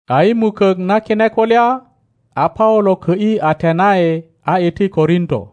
A i mukök na kine kulya, a Paulo kö ’yi Atenai a iti Korinto.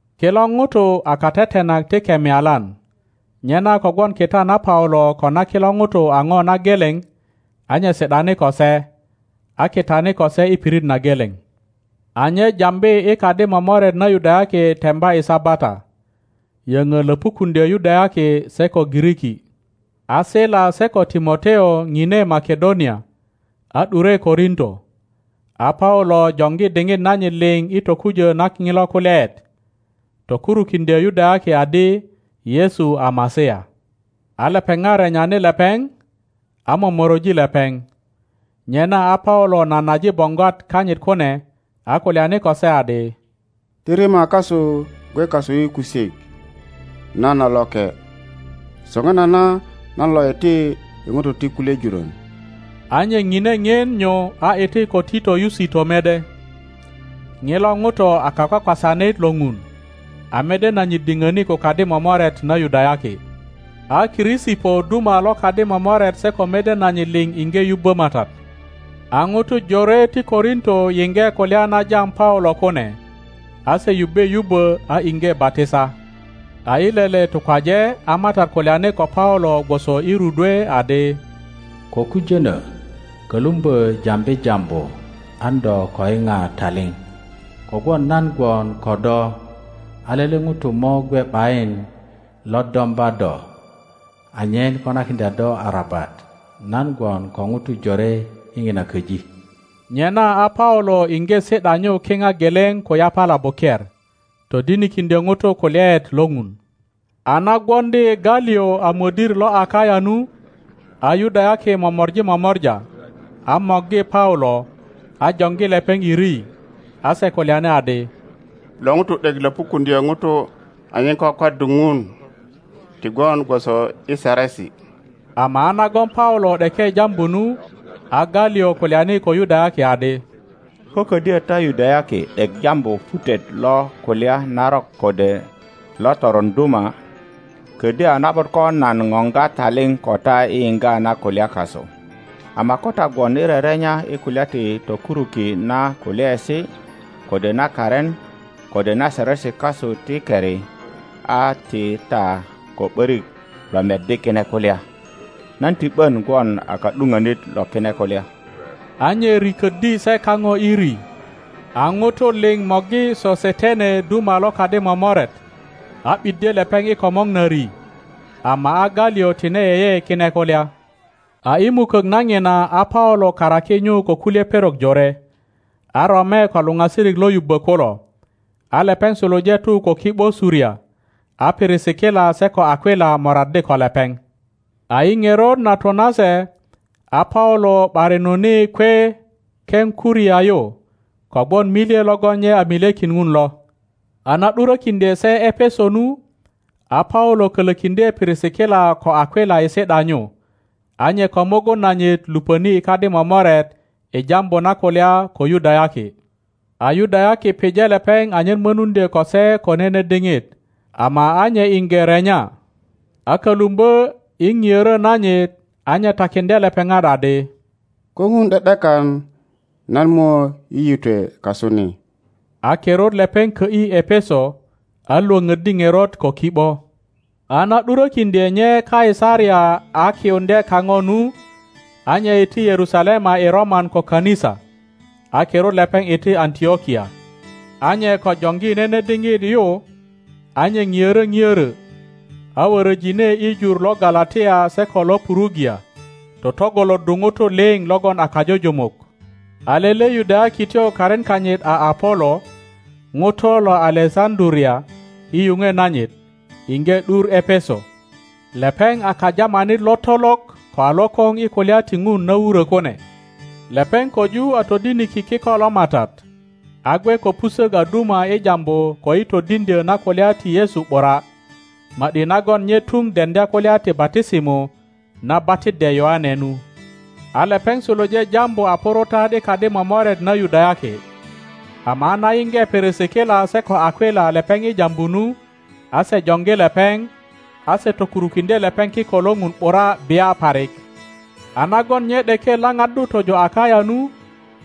Kilo ŋutu a katetenak ti kemialan; nyena kogwon kita na Paulo ko na kilo ŋutu a ŋo na geleŋ, a nye si ’dani ko se, a kitani ko se i pirit na geleŋ. A nye jambi i kadi momoret na Yudayaki temba i Sabata, yöŋö löpukuŋdyö Yudayaki se ko Giriki. A Sila se ko Timoteo ŋine Makedonia, a ’dure Korinto, a Paulo joŋgi diŋit nanyit liŋ i tokujö na ŋilo kulyaet, tokurukiŋdyö Yudayaki adi Yesu a Masia. A lepeŋat renyani lepeŋ, a momoroji lepeŋ. Nyena a Paulo nanaji boŋgwat kanyit kune, a kulyani ko se adi, Ti rima kasu gwe kasu i kusik! Nan a loke. Soŋinana nan lo iti i ŋutu ti kulye jurön. A nye ŋine ŋien nyu a iti ko Tito Yusito mede. Ŋilo ŋuto a kakwakwasanit lo Ŋun, a mede nanyit diŋöni ko kadi momoret na Yudayaki. A Krisipo duma lo kadi momoret se ko mede nanyit liŋ iŋge yubbö Matat. A ŋutu jore ti Korinto yiŋge kulya na jam Paulo kune, a se yubbe yubbö a iŋge batisa. A i lele tukwaje a Matat kulyani ko Paulo gwoso i rudwe adi, Ko kujönö; kölumbö jambi jambu, an do ko yiŋa taliŋ; kogwon nan gwon ko do, a lele ŋuto mo gwe ’bayin lo domba do anyen konakiŋdya do arabat. Nan gwon ko ŋutu jore i ŋina köji. Nyena a Paulo iŋge si ’da nyu kiŋa geleŋ ko yapala buker, todinikindyö ŋutu kulyaet lo Ŋun. A na gwoŋdi Galiŋ a mödir lo Akaya nu, a Yudayaki momori momora, a morgi Paulo, a joŋgi lepeŋ i ri. A se kulyani adi, Lo ŋuto ’dek löpukuŋdyö ŋutu anyen kwakwaddu Ŋun, ti gwon gwoso i saresi. Ama a nagon Paulo ’deke jambu nu, a Galiŋ kulyani ko Yudayaki adi, Ko ködyö ta Yudayaki ’dek jambu putet lo kulya narok kode lo toron duma, ködyö a na ’but ko nan poŋga taliŋ ko ta i yiŋga na kulya kasu; ama ko ta gwon i rerenya i kulya ti tokuruki na kulyaesi, kode na karin, kode na saresi kasu ti keri, a ti ta ko ’börik lo meddi kine kulya. Nan ti ’bön gwon a ka ’dupönit lo kine kulya. a nye riköddi se kaŋo i ri. A ŋutu liŋ morgi Sosetene duma lo kadi momoret, a ’biddye lepeŋ i komor na ri. Ama a Galiŋ tine yeye kine kulya. A i mukök na ŋina a Paulo karaki nyu ko kulye perok jore, a rome ko luŋasirik lo yubbö kulo, a lepeŋ suluje tu ko ki ’bo Suria, a Pirisikila se ko Akwila moraddi ko lepeŋ. A i ŋerot na tu nase, a Paulo ’barinuni kwe Kepkuria yu kogwon milye logon nye milyekin Ŋun lo. A na ’durökiŋdye se Epeso nu, a Paulo kölökiŋdye Pirisikila ko Akwila i si ’da nyu, a nye ko mugun nanyit luŋoni i kadi momoret i jambu na kulya ko Yudayaki. a Yudayaki pije lepeŋ anyen mönuŋdyö ko se ko nene diŋit, ama a nye iŋge renya, a kölumbö i piörö nanyit, a nye takiŋdye lepeŋat adi, Ko Ŋun ’de ’dekan nan mo yiyitwe kasu ni. A kirut lepeŋ kö ’yi Epeso, a lwöpöddi ŋerot ko ki ’bo. A na ’durökiŋdye nye Kaisaria a kiyuŋdye kaŋo nu, a nye iti Yerusalema i roman ko kanisa, a kirut lepeŋ iti Antlokia. a nye ko joŋgi nene diŋit yu, a nye piörö piörö, a wöröjine i jur lo Galatia se ko lo Purugia totŋgoloddu ŋutu liŋ logon a kajujumuk. A lele Yudayakityo karin kanyit a Apolo, ŋuto lo Alesaŋduria i yuŋwe nanyit, iŋge ’dur Epeso. Lepeŋ a kajamanit lotolok ko a lokoŋ i kulya ti Ŋun na wurö kune. Lepeŋ köju a todiniki kiko lo Matat, a gwe ko pusök a duma i jambu ko i todiŋdyö na kulya ti Yesu ’bura, ma ’di nagon nye tuŋ deŋdya kulya ti batisimo na batiddye Yoane nu. a lepeŋ suluje jambu a purutat i kadi momoret na Yudayaki, ama a na yiŋge Pirisikila se ko Akwila lepeŋ i jambu nu, a se joŋgi lepeŋ, a se tokurukiŋdye lepeŋ kiko lo Ŋun ’bura bia parik. A nagon nye ’deke lapaddu tojo Akaya nu,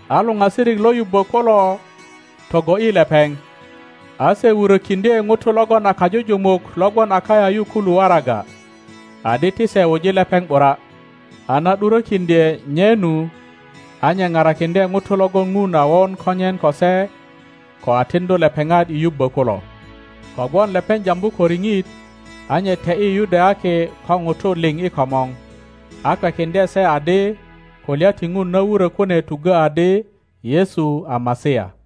a luŋasirik lo yubbö kulo togo ’yi lepeŋ, a se wurökiŋdye ŋutu logon a kajujumuk lo gwon Akaya yu kulu waraga, adi ti se wuji lepeŋ ’bura. A na ’durökiŋdye nye nu, a nye parakiŋdye ŋutu logon Ŋun a won konyen ko se ko a tiŋdu lepeŋat i yubbö kulo, kogwon lepeŋ jambu ko riŋit, a nye te ’yi Yudayaki ko ŋutu liŋ i komor, a kwekiŋdye se adi kulya ti Ŋun na wurö kune tuggö adi Yesu a Masia.